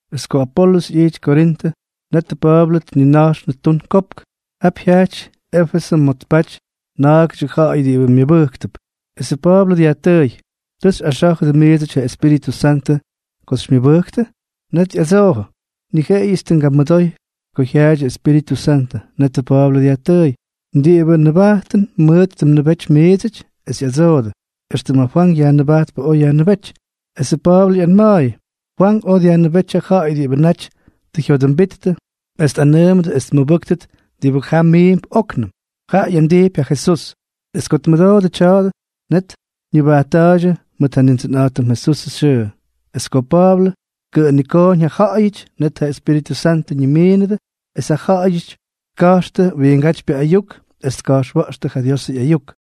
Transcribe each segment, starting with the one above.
Es ko Apolʉs ꞌyijty Korintʉ, netʉ Pa̱a̱blʉ tnina̱jxnʉ tun kopk. Ta jyajty Éfesʉ ma̱ tpaty na̱a̱gʉdyʉ ja̱ꞌa̱y diꞌibʉ myʉbʉjktʉp. Esʉ Pa̱a̱blʉ dyajtʉʉy: —¿Tʉ xyꞌaxá̱jʉdʉ miidsʉty ja Espíritʉ Santʉ ko xymyʉbʉjktʉ? Net ꞌyadsoodʉ: —Ni jeꞌeyʉts tʉ ngamʉdoy ko jyaadyʉ Espíritʉ Santʉ. Netʉ Pa̱a̱blʉ dyajtʉʉy: —¿Diꞌibʉ nʉbajtʉn mʉʉt tʉ mnʉbety miidsʉty? Es ꞌyadsoodʉ: —Extʉm ja Fwank Yajnʉbajtpʉ oj yajnʉbéty. Esʉ Pa̱a̱blʉ ꞌyanma̱a̱yʉ: —Fwank oj dyajnʉbéty ja ja̱ꞌa̱y diꞌibʉ naty tʉ jyodʉmbittʉ, es tꞌanʉʉmʉdʉ es tmʉbʉ́ktʉt diꞌibʉ ja miimp óknʉm, jaꞌa ꞌyandijpy ja Jesús. Es ko tmʉdoodʉ tya̱a̱dʉ, net ñʉbajtta̱a̱ydyʉ mʉt ja Nindsʉnꞌa̱jtʉm Jesusʉ xyʉʉ. Es ko ja Pa̱a̱blʉ tkʉꞌʉnikooñ ja ja̱ꞌa̱yʉty, net ja Espíritʉ Santʉ ñimiinʉdʉ, es ja ja̱ꞌa̱yʉty tka̱jxtʉ wiingátypyʉ ayuk es tka̱jxwa̱ꞌxtʉ ja Diosʉ ꞌyayuk.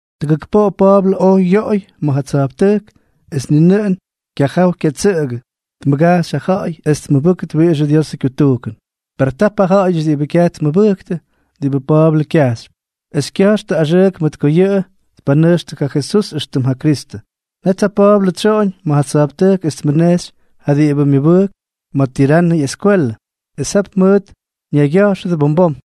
Tʉgʉk poꞌo Pa̱a̱blʉ oj yoꞌoy ma̱ ja tsa̱jptʉjk, es ni nʉꞌʉn kyaja̱ꞌa̱w kyatsʉꞌkʉ tmʉgajxy ja ja̱ꞌa̱y es tmʉbʉ́ktʉt wiꞌix ja Diosʉ kyutujkʉn. Per tap ja ja̱ꞌa̱yʉty diꞌibʉ kyaj tmʉbʉjktʉ diꞌibʉ Pa̱a̱blʉ kyajxypy, es kya̱jxtʉ axʉʉk mʉt ko yʉꞌʉ tpanʉjxtʉ ja Jesús éxtʉm ja Kristʉ. Net ja Pa̱a̱blʉ tsyoꞌoñ ma̱ ja tsa̱jptʉjk es tmʉnejxy ja diꞌibʉ myʉbʉjk ma̱ Tiranʉ ꞌyeskwelʉ, es jap mʉʉt ñaygya̱jxʉdʉ bom bom.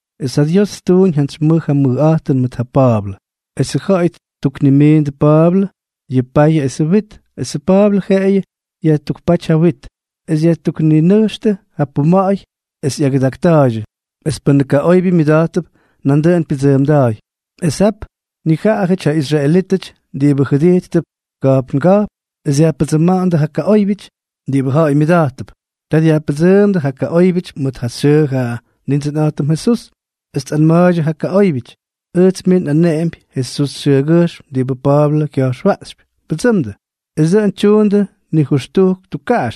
Es ja Dios ttuuñ jantsy mʉj ja mʉjꞌa̱jtʉn mʉt ja Pa̱a̱blʉ. Esʉ ja̱ꞌa̱y ttuknimiindʉ Pa̱a̱blʉ yʉ payʉ esʉ wit, esʉ Pa̱a̱blʉ jeꞌeyʉ yajtukpáty ja wit, es yajtukninʉjxtʉ ja puma̱ꞌa̱y es ꞌyagʉdakta̱a̱ydyʉ. Es pʉ́nʉ kaꞌoybyʉ myʉda̱jttʉp, nandʉꞌʉn pyʉdsʉʉmda̱ꞌa̱y. Es jap nijaꞌajʉty ja israelítʉty diꞌibʉ jʉdijttʉp ka̱jpnga̱jpn es dyajpʉdsʉ́mdʉ ja kaꞌóybyʉty diꞌibʉ ja̱ꞌa̱y myʉda̱jttʉp. Ta tjayajpʉdsʉmandʉ ja kaꞌóybyʉty mʉt ja xyʉʉ ja Nindsʉnꞌa̱jtʉm Jesús, es tꞌanma̱a̱ydyʉ ja kaꞌóybyʉty: —Ʉjts mij nꞌaneꞌempy Jesús xyʉgyʉjxm diꞌibʉ Pa̱a̱blʉ kya̱jxwaꞌxypy, ¡pʉdsʉmdʉ! Es dʉꞌʉn tyuundʉ nijʉxtujk tukkaꞌax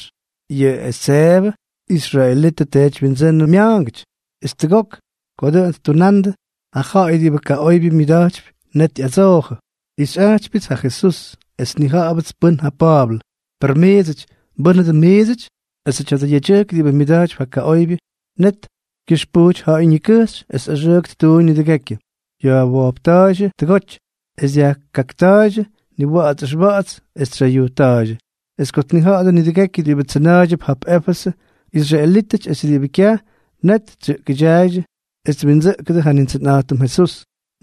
yʉ Eseevʉ, israelitʉ teedywyindsʉ́nʉ mya̱a̱ngʉty. Es tʉgok ko dʉꞌʉn ttunandʉ, ja ja̱ꞌa̱y diꞌibʉ kaꞌoybyʉ myʉda̱jtypyʉ net ꞌyadsoojʉ: —Nꞌixyꞌajtypyʉts ja Jesús, es nnija̱ꞌa̱bʉts pʉ́n ja Pa̱a̱blʉ, per miidsʉty, ¿mbʉ́nʉ dʉꞌʉn miidsʉty? Esʉ tya̱dʉ yedyʉjk diꞌibʉ myʉda̱jtypy ja kaꞌoybyʉ, net kyʉxpujty ja̱ꞌa̱y ñikʉjxy es axʉʉk ttuuñ nidʉgekyʉ, yajwojpta̱a̱ydyʉ tʉgoty, es dyajkakta̱a̱ydyʉ niwa̱ꞌa̱ts ʉxwa̱ꞌa̱ts es tsyayujtta̱a̱ydyʉ. Es ko tnija̱ꞌa̱dʉ nidʉgekyʉ diꞌibʉ tsʉna̱a̱ydyʉp jap Éfesʉ, israelítʉty es diꞌibʉ kyaj, net tsyʉꞌkʉdyaaydyʉ es twindsʉꞌkʉdʉ ja Nindsʉnꞌa̱jtʉm Jesús.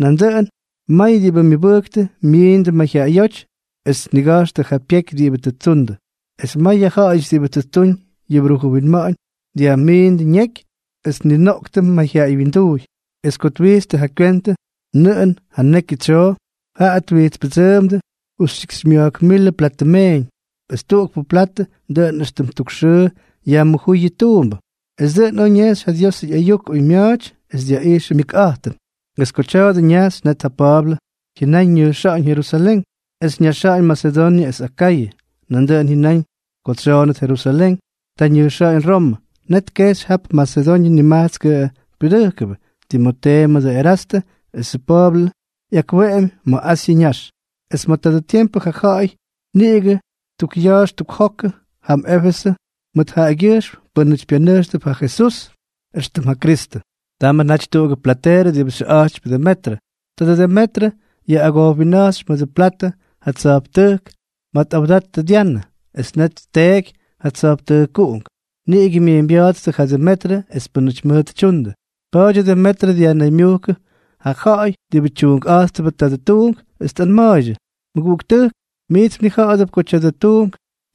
Nandʉꞌʉn may diꞌibʉ myʉbʉjktʉ myiindʉ mayjyaꞌayóty es tniga̱jxtʉ ja pyeky diꞌibʉ tʉ ttundʉ, es may yʉ ja̱ꞌa̱yʉty diꞌibʉ tʉ ttuñ yʉ brujʉ winma̱ꞌa̱ñ, dyajmiindʉ ñeky es tninoꞌktʉ mayjyaꞌay wyinduuy. Es ko twijtstʉ ja kywentʉ nʉꞌʉn ja ñekyʉ tsyoo, jaꞌa twijtspʉdsʉʉmdʉ justyikxymya̱jk milʉ platʉ meeñ, es tuꞌukpʉ platʉ dʉꞌʉn éxtʉm tuk xʉʉ yajmʉjúy yʉ tuumbʉ. Es dʉꞌʉn oj ñejxy ja Diosʉ ꞌyayuk oymya̱a̱ty es dyaꞌijxʉ myʉkꞌa̱jtʉn. Es ko tya̱a̱dʉ ñajxy, net ja Pa̱a̱blʉ jyʉnáñ ñʉjxa̱ꞌa̱ñ Jerusalén, es ñaxa̱ꞌa̱ñ Masedoñʉ es Akayʉ. Nandʉꞌʉn jyʉnáñ ko tsyoonʉt Jerusalén, ta ñʉjxa̱ꞌa̱ñ Romʉ. Net tkejxy jap Masedoñʉ nimajtskʉ pyudʉjkʉbʉ, Timotee mʉdʉ Erastʉ, esʉ Pa̱a̱blʉ ꞌyakweꞌemy ma̱ Asyʉ ñax. Es ma̱ tadʉ tiempʉ ja ja̱ꞌa̱y niꞌigʉ ttukꞌya̱ꞌa̱x ttukjoktʉ jam Éfesʉ mʉt jaꞌagyʉjxm pʉ́nʉty pyanʉjxtʉp ja Jesús éxtʉm ja Kristʉ. Tamʉ naty tuꞌugʉ plateerʉ diꞌibʉ xyʉꞌa̱jtypy Demetrʉ. Tadʉ Demetrʉ yaꞌꞌagojwinna̱jxypy mʉdʉ platʉ ja tsa̱jptʉjk ma̱ tꞌawdattʉ Dyanʉ, es net tteeky ja tsa̱jptʉjkuꞌunk. Niꞌigʉ myeeñbya̱a̱ttʉ ja Demetrʉ es pʉ́nʉty mʉʉt tyundʉ. Pa̱a̱dyʉ Demetrʉ dyajnaymyujkʉdʉ ja ja̱ꞌa̱y diꞌibʉ tyuunkꞌa̱jttʉbʉ tadʉ tuunk, es tꞌanma̱a̱ydyʉ: —Mʉguꞌuktʉjk, miits mnija̱ꞌa̱dʉp ko tya̱dʉ tuunk,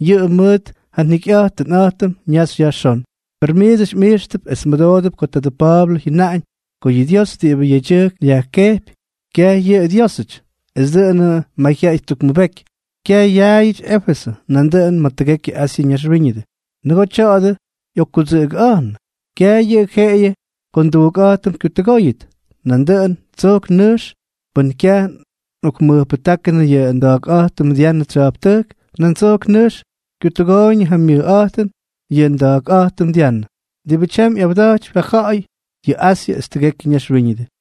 yʉꞌʉ mʉʉt ja jikyꞌa̱jtʉn ñaxy yajxón. Per miits mꞌijxtʉp es mmʉdoodʉp ko tadʉ Pa̱a̱blʉ jyʉnaꞌañ ko yʉ dios diꞌibʉ yedyʉjk kyoj yaꞌoꞌoyʉdʉp, kyaj yʉꞌʉ Dyiósʉty. Es dʉꞌʉnʉ mayjyaꞌay ttukmʉbeky, kyaj yaayʉty Éfesʉ, nandʉꞌʉn ma̱ tʉgekyʉ Asyʉ ñaxwíñʉdʉ. Nʉgoo tya̱a̱dʉ tꞌokkudsʉꞌʉgʉꞌa̱jnʉ, kyaj yʉꞌʉ jeꞌeyʉ ko nduunkꞌa̱jtʉm kyutʉgóyʉt, nandʉꞌʉn tsojk nʉjkx pʉ́n kyaj tꞌokmʉjpʉjtáknʉ yʉ nda̱a̱kꞌa̱jtʉm Dyanʉ tsya̱jptʉjk, nan tsojk nʉjx kyutʉgooyñʉ ja myʉjꞌa̱jtʉn yʉ nda̱a̱kꞌa̱jtʉm Dyanʉ, diꞌibʉ tyam ꞌyawda̱jtypy ja ja̱ꞌa̱y ya̱ Asyʉ es tʉgekyʉ naxwíñʉdʉ.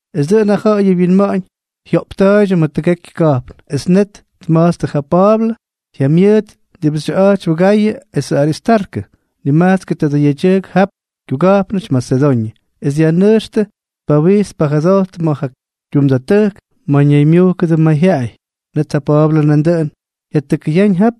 Es dʉꞌʉn ja ja̱ꞌa̱yʉ wyinma̱ꞌa̱ñ jyoꞌpta̱a̱ydyʉ ma̱ tʉgekyʉ ka̱jpn. Es net tma̱jtstʉ ja Pa̱a̱blʉ jyamyʉʉt diꞌibʉ xyʉꞌa̱jtypy Gayʉ esʉ Aristarkʉ, nimajtskʉ tadʉ yedyʉjk jap kyuga̱jpnʉty Masedoñʉ, es dyajnʉjxtʉ tpawijts tpajʉdojttʉ ma̱ ja kyumda̱ttʉjk, ma̱ ñaymyujkʉdʉ mayjyaꞌay. Net ja Pa̱a̱blʉ nandʉꞌʉn jyatʉkʉyáñ jap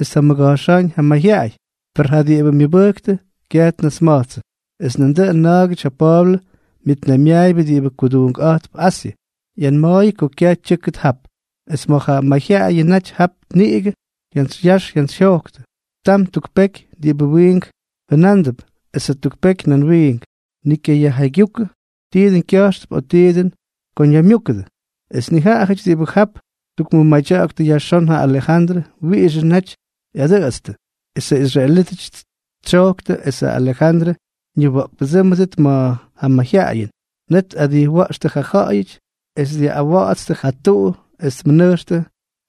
es tjamʉga̱jxáñ ja mayjyaꞌay, per ja diꞌibʉ myʉbʉjktʉ kyaj ñasma̱jtsʉ. Es nandʉꞌʉn na̱a̱gʉty ja Pa̱a̱blʉ myʉtnaymyaayʉbʉ diꞌibʉ kuduunkꞌa̱jttʉp Asyʉ, ꞌyanma̱a̱yʉ ko kyaj tyʉ́kʉt jap. Es ma̱ ja mayjyaꞌayʉ naty jap niꞌigʉ jyantsyya̱ꞌa̱x jyantsyjyoktʉ, tam tuk peky diꞌibʉ wiink jʉnándʉp, es jatuk peky nan wiink. Ni kyayajjaygyúkʉ ti dʉn kya̱jxtʉp o ti dʉn ko ñaymyúkʉdʉ. Es nijaꞌajʉty diꞌibʉ jap ttukmʉmadyaktʉ yajxón ja Alejandrʉ wiꞌixʉ naty ꞌyadʉꞌʉtstʉ. Es ja israelítʉty tsyojktʉ esʉ Alejandrʉ ñiwa̱ꞌkpʉdsʉ́mʉdʉt ma̱ ja mayjyaꞌayʉn. Net tꞌadijwa̱ꞌxtʉ ja ja̱ꞌa̱yʉty es dyaꞌꞌawatstʉ ja tuꞌu es tmʉnʉjxtʉ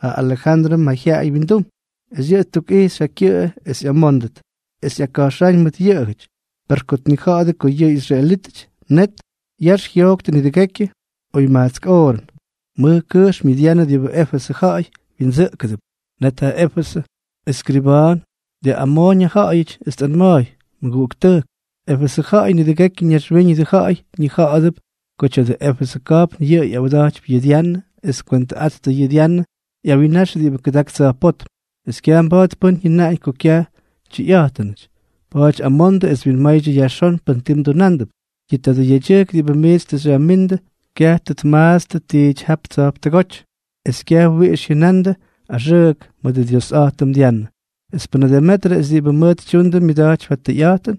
ja Alejandrʉ mayjyaꞌay wyindum. Es yʉꞌʉ ttukꞌijxy ja kyʉꞌʉ es ꞌyamóndʉt es jyaka̱jxáñ mʉt yʉꞌʉjʉty. Per ko tnija̱ꞌa̱dʉ ko yʉꞌʉ ꞌyisraelítʉty, net yax jyojktʉ nidʉgekyʉ oy majtsk oorʉn: —¡Mʉj kʉjxm yʉ Dyanʉ diꞌibʉ Éfesʉ ja̱ꞌa̱y wyindsʉꞌkʉdʉp! Net ja Éfesʉ ʉskriba̱a̱n dyaꞌꞌamooñ ja ja̱ꞌa̱yʉty, es tꞌanma̱a̱y: —Mʉguꞌuktʉjk, Éfesʉ ja̱ꞌa̱yʉty, nidʉgekyʉ naxwíñʉdʉ ja̱ꞌa̱y ñija̱ꞌa̱dʉp ko tya̱dʉ Éfesʉ ka̱jpn yʉꞌʉ ꞌyawda̱jtypy yʉ Dyanʉ es tkwentʉꞌattʉ yʉ Dyanʉ ꞌyawinnax diꞌibʉ kʉdak tsa̱jpótm. Es kyaj mba̱a̱t pʉ́n jyʉnaꞌañ ko kyaj tyʉyꞌa̱jtʉnʉty. Pa̱a̱ty amondʉ es winmaydyʉ yajxón pʉn ti mdunándʉp. Yʉ tadʉ yedyʉjkʉty diꞌibʉ miits tʉ xyajmíndʉ, kyaj tʉ tmaatstʉ tiity jap tsa̱jptʉgóty es kyaj wiꞌix jyʉna̱ꞌa̱ndʉ axʉʉk mʉdʉ ndiosꞌa̱jtʉm Dyanʉ. Es pʉnʉ Demetrʉ esʉ diꞌibʉ mʉʉt tyundʉ myʉda̱jtypy ja tʉyꞌa̱jtʉn,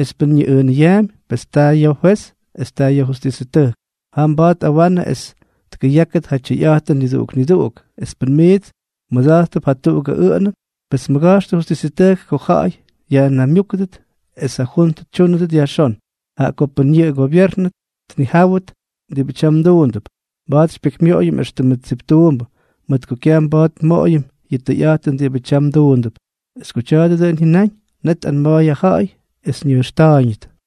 es pʉn ñiꞌʉʉnʉyaampy, pes taa yʉ fwez es taa yʉ justisʉtʉjk. Jam mba̱a̱t tꞌawanʉ es tkʉyákʉt ja tyʉyꞌa̱jtʉn niduꞌuk niduꞌuk. Es pʉn miits mmʉda̱jttʉp jatuꞌugʉ ʉꞌʉnʉn, pes mʉga̱jxtʉ justisʉtʉjk ko ja̱ꞌa̱y yajnaymyúkʉdʉ esʉ juntʉ xytyúndʉt yajxón. Jaꞌa ko pʉn yʉꞌʉ gobyeernʉ tnijáwʉt diꞌibʉ tyam mduundʉp, mba̱a̱t xypyekymyoꞌoyʉm éxtʉmʉ tsiptuumbʉ, mʉt ko kyaj mba̱a̱t nmoꞌoyʉm yʉ tʉyꞌa̱jtʉn diꞌibʉ tyam mduundʉp. Es ko tya̱a̱dʉ dʉꞌʉn jyʉnáñ, net tꞌanma̱a̱y ja ja̱ꞌa̱y es ñʉjxta̱a̱yñʉt.